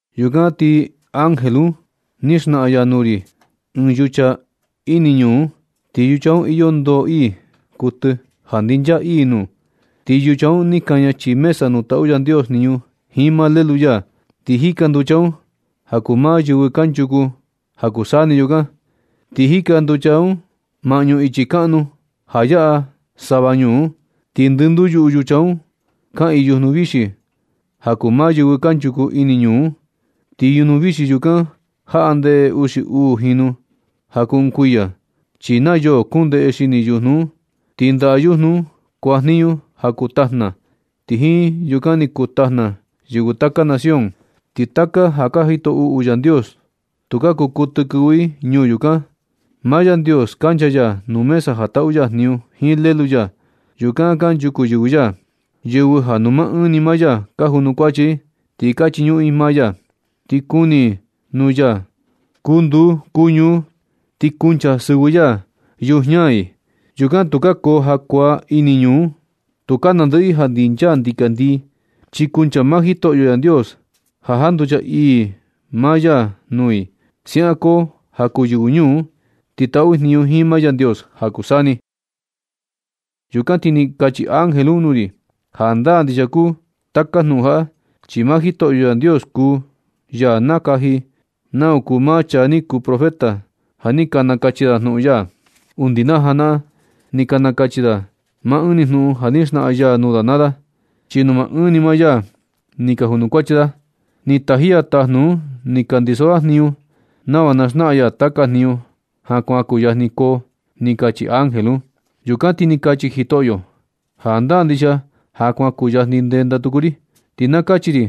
Yukan ti ángel un ni xnaꞌan ya nuu ri ɨɨn yucha ini ñuu un. Ti yucha un iyo ndoo ii kuɨtɨ ja ndinchaa ii nuu. Ti yucha un ni kaña chii mesa nuu taꞌu Yandios jniñu jiin maa Lelu ya. Ti jika nducha un ja kuu maa yɨvɨ kanchuku ja kuu taka saa ni yukan. Ti jika nducha un sava maꞌñu ichi kaꞌnu ja yaꞌa sava ñuu un. Ti ndɨnduu yuꞌu yucha un kaꞌiin yujnu vixi ja kuu maa yɨvɨ kanchuku ini ñuu un. Ti yujnu vixi yukan jaꞌa ndeꞌe uxi uu jinu ja kuu ɨɨn kuiya, chi na yoo kuun ndeꞌe xini yujnu un. Ti ndaꞌa yujnu un kuajniñu ja kuu tajna, ti jiin yukan ni kuu tajna yɨvɨ taka nación. Ti taka ja ka jito uꞌu Yandios tukaa kuu kuɨtɨ kɨvɨ ini ñuu yukan. Maa Yandios kancha ya nuu mesa ja taꞌu ya jniñu jiin Lelu ya. Yukan kanchuku yɨvɨ ya, yɨvɨ ja nuu maa ɨɨn ni maa ya ka junukuachi i. Ti ka chiñuꞌun i maa ya. Ti kuni i nuu ya kuu nduu kuu ñuu, ti kuncha sɨvɨ ya yujiña i. Yukan tukaa koo jakuaa ini ñuu un. Tukaa nandɨꞌɨ i ja ndinchaa ndikandii, chi kuncha maa Jitoꞌyo Yandios ja janducha ii maa ya nuu i. Siaꞌan koo ja kuu yɨvɨ ñuu un, ti taꞌu i jniñu jiin maa Yandios ja kuu saa ni. Yukan ti ni kachi ángel un nuu ri: ―Jandaa ndixia kuu taka jnuꞌun jaꞌa, chi maa Jitoꞌyo Yandios kuu ya nakaji nau kuu maa chaa ni kuu profeta ja ni nakachi da jnuꞌun ya. Undi najanaꞌan ni ka nakachi da maa ɨɨn ni jnuꞌun ja ni xnaꞌan ya nuu da naa da, chi nuu maa ɨɨn ni maa ya ni ka junukuachi da. Ni taji ya tajnu un ni ka ndiso da jniñu, nava na xnaꞌan ya taka jniñu ja kuan kuyajni koo ―ni kachi ángel un. Yukan ti ni kachi Jitoꞌyo: ―Jandaa ndixia ja kuan kuyajni ndenda tuku ri. Ti na kachi ri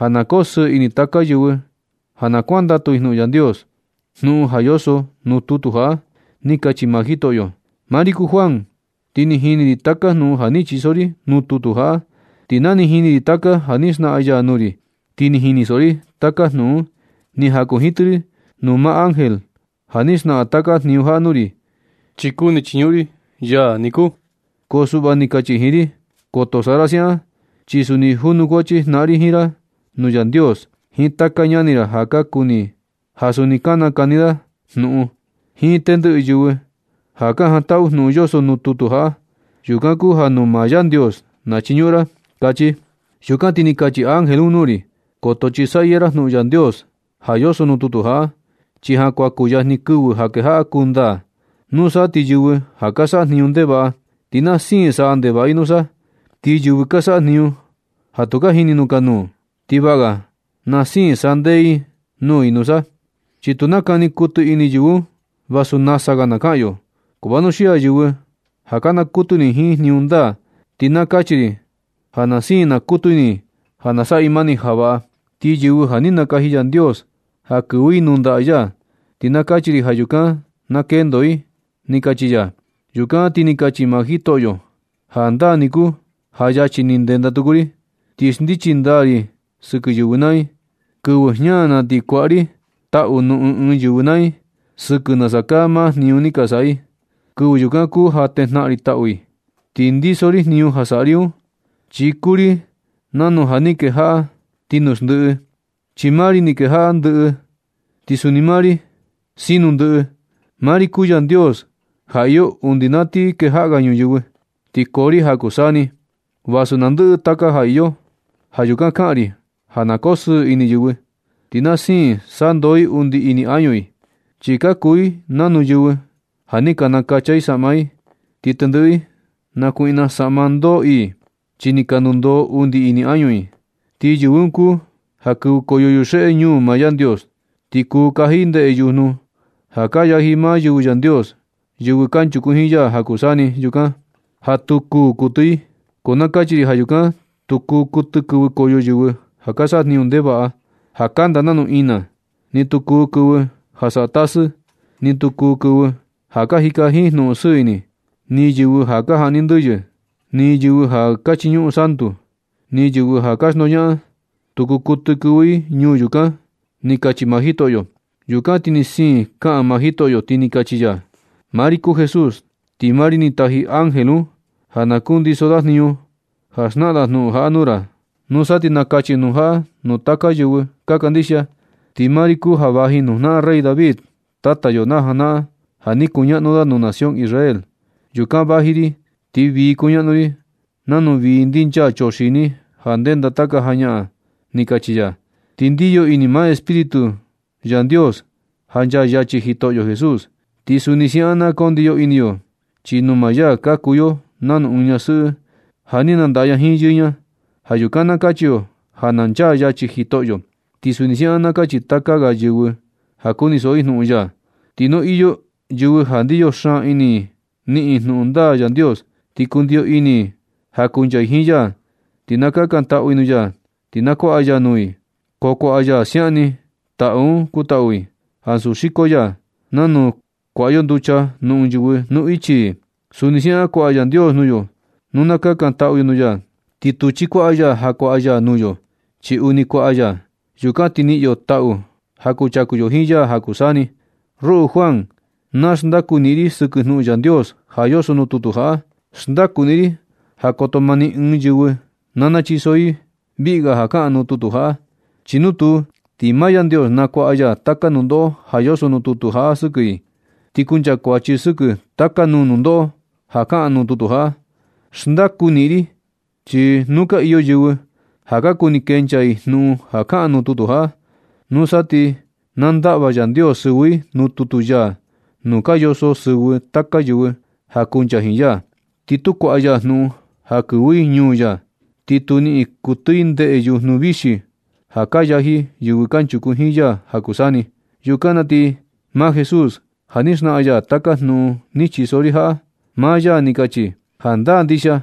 ja na koo sɨɨ ini taka yɨvɨ ja kuandatu i jnuꞌun Yandios, jnuꞌun ja yoso nuu tutu jaꞌa―ni kachi maa Jitoꞌyo. Maa ri kuu Juan, ti ni jini ri taka jnuꞌun ja ni chiso ri nuu tutu jaꞌa. Ti na ni jini ri taka ja ni xnaꞌan ya nuu ri, ti ni jinisoꞌo ri taka jnuꞌun un, ni jakunjitɨ ri nuu maa ángel ja ni xnaꞌan taka jniñu jaꞌa nuu ri, chi kuni chiñuꞌun ri ya niku. Ko suꞌva ni kachi ya jiin ri: ―Koto saꞌa ra siaꞌan, chi suni junukuachi jnaꞌan ri jiin ra nuu Yandios, jiin taka ñani ra ja suni ka nakani da jnuꞌun da, jiin tendiꞌi yɨvɨ ja ka jantaꞌu jnuꞌun yoso nuu tutu jaꞌa. Yukan kuu ja nuu maa Yandios na chiñuꞌun ra ―kachi da. Yukan ti ni kachi ángel un nuu ri: ―Koto chisaꞌyɨ ra jnuꞌun Yandios ja yoso nuu tutu jaꞌa, chi ja kuan kuyajni kɨvɨ ja kejaꞌa kuu ndaa. Nusa ti yɨvɨ ja ka saꞌa jniñu ndevaꞌa, ti na siin saꞌa ndevaꞌa i nusa. Ti yɨvɨ ka saꞌa jniñu ja tu ka jini jnukanuu, ti vaꞌga na siin sandee nuu i nusa. Chi tu nakani kuɨtɨ ini yɨvɨ un vasu nasa ga na kaꞌan yo. Ko vanuxii yɨvɨ ja ka nakutu ini jiin jniñu ndaa, ti na kachi ri ja na siin nakutu ini i ja saꞌa i mani ja vaꞌa. Ti yɨvɨ ja ni nakaji Yandios ja kɨvɨ i nuu ndaꞌa ya, ti na kachi ri ja yukan na kendo i ―ni kachi ya. Yukan ti ni kachi maa Jitoꞌyo: ―Jandaa ni kuu ja yachi ni ndenda tuku ri, ti xndichi ndaa ri sɨkɨ yɨvɨ naa i. Kɨvɨ jña na ti nakuaꞌa ri taꞌu nuu ɨɨn ɨɨn yɨvɨ naa i sɨkɨ nasa kaa maa jniñu ni ka saꞌa i. Kɨvɨ yukan kuu ja tejnaꞌan ri taꞌu i. Ti ndiso ri jniñu ja saꞌa ri un, chi kuu ri nanu letra A jiin Z nuu kejaꞌa ti nuu xndiꞌi, chi maa ri ni skejaꞌa ndɨꞌɨ, ti suni maa ri kin sino. Maa ri kuu Yandios ja iyo undi na sa ti kejaꞌa ga ñuyɨvɨ, ti koo ri ja kuu saa ni vasu naa ndɨꞌɨ taka ga ja iyo. Ja yukan kaꞌan ri ja na koo sɨɨ ini yɨvɨ, ti na siin sandoo i undi ini añu i. Chi ka kuu i nanu yɨvɨ ja ni ka nakacha i saꞌma i, ti tendɨꞌɨ i nakuiꞌna saꞌma ndoo ii, chi ni ka ndundoo undi ini añu i. Ti yɨvɨ un kuu ja kɨvɨkoyo yuxeꞌe ñuu maa Yandios, ti kuu kaji i ndeꞌe yujnu ja ka yaji maa yɨvɨ Yandios, yɨvɨ kanchuku jiin ya ja kuu saa ni yukan, ja tu kuū kuɨtɨ i. Ko na kachi ri ja yukan tu kuu kuɨtɨ kɨvɨkoyo yɨvɨ ja ka saꞌa jniñu ndevaꞌa, ja kanda nanu ina. Ni tu kuu kɨvɨ ja saꞌa tasɨ. Ni tu kuu kɨvɨ ja ka jika jiin jnuꞌun sɨɨ ini, ni yɨvɨ ja ka jaꞌni ndɨyɨ, ni yɨvɨ ja ka chiñuꞌun santu, ni yɨvɨ ja ka xndoñaꞌan, tu kuu kuɨtɨ kɨvɨ i ñuu yukan ―ni kachi maa Jitoꞌyo. Yukan ti ni siin kaꞌan maa Jitoꞌyo, ti ni kachi ya: ―Maa ri kuu Jesús. Ti maa ri ni taji ángel un ja ka ndiso da jniñu ja xnaꞌan da jnuꞌun jaꞌa nuu ra. Nusa ti nakachi jnuꞌun jaꞌa nuu taka yɨvɨ ka kandixia. Ti maa ri kuu ja vaji nuu jnaꞌan rey David, tata yo najanaꞌan ja ni kuñaꞌnu da nuu nación Israel. Yukan vaji ri ti vii kuñaꞌnu ri nanu vii ndinchaa chuxini ja ndenda taka jañaꞌan ―ni kachi ya. Ti ndiyo ini maa Espíritu Yandios ja nchaa yachi Jitoꞌyo Jesús. Ti suni siaꞌan ka ndiyo ini yo, chi nuu maa ya ka kuu yo nanu ɨɨn ñasɨꞌɨ ja ni nandaꞌa ña jiin yɨɨ ña. Ja yukan na kachi yo ja nchaa yachi Jitoꞌyo. Ti suni siaꞌan na kachi taka ga yɨvɨ ja kunisoꞌo i jnuꞌun ya. Ti nu iyo yɨvɨ ja ndiyo xaan ini i niꞌin i jnuꞌun ndaa Yandios, ti kundiyo ini i ja kuncha i jiin ya, ti na kakantaꞌu i nuu ya ti na kuaꞌa ya nuu i, ko kuaꞌa ya siaꞌan ni taꞌu un kutaꞌu i, ansu xiko ya. Nanu kuaꞌa yo nducha nuu ɨɨn yɨvɨ nuu ichi i, suni siaꞌan kuaꞌa Yandios nuu yo nu na kakantaꞌu yo nuu ya. Ti tu chikuaꞌa ya ja kuaꞌa ya nuu yo, chi uuni kuaꞌa ya. Yukan ti niꞌin yo taꞌu ja kuchaku yo jiin ya ja kuu saa ni. Ruꞌu Juan, na xndaku niꞌin ri sɨkɨ jnuꞌun Yandios ja yoso nuu tutu jaꞌa. Xndaku niꞌin ri ja koto ma ni ɨɨn yɨvɨ na nachiso i viꞌga ja kaꞌan nuu tutu jaꞌa, chi nu tuu, ti maa Yandios nakuaꞌa ya taka nundoꞌo ja yoso nuu tutu jaꞌa sɨkɨ i. Ti kuncha kuachi sɨkɨ taka nuu nundoꞌo ja kaꞌan nuu tutu jaꞌa. Xndaku niꞌin ri chi nu ka iyo yɨvɨ ja ka kuni kenchaa i ɨɨn jnuꞌun ja kaꞌan nuu tutu jaꞌa, nusa ti na ndaꞌva Yandios sɨvɨ i nuu tutu ya nuu ka yoso sɨvɨ taka yɨvɨ ja kuncha jiin ya. Ti tu kuaꞌa ya jnuꞌun ja kɨvɨ i ñuu ya. Ni tu niꞌin kuɨtɨ i ndeꞌe yujnu vixi ja ka yaji yɨvɨ kanchuku jiin ya ja kuu saa ni. Yukan na ti maa Jesús, ja ni xnaꞌan ya taka jnuꞌun ni chiso ri jaꞌa, maa ya ni kachi: ―Jandaa ndixia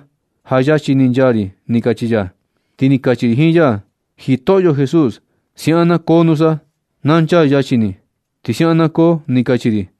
ja yachi ni nchaa ri ―ni kachi ya. Ti ni kachi ri jiin ya: ―Jitoꞌyo Jesús, siaꞌan na koo nusa. Na nchaa yachi ni. Ti siaꞌan na koo ―ni kachi ri.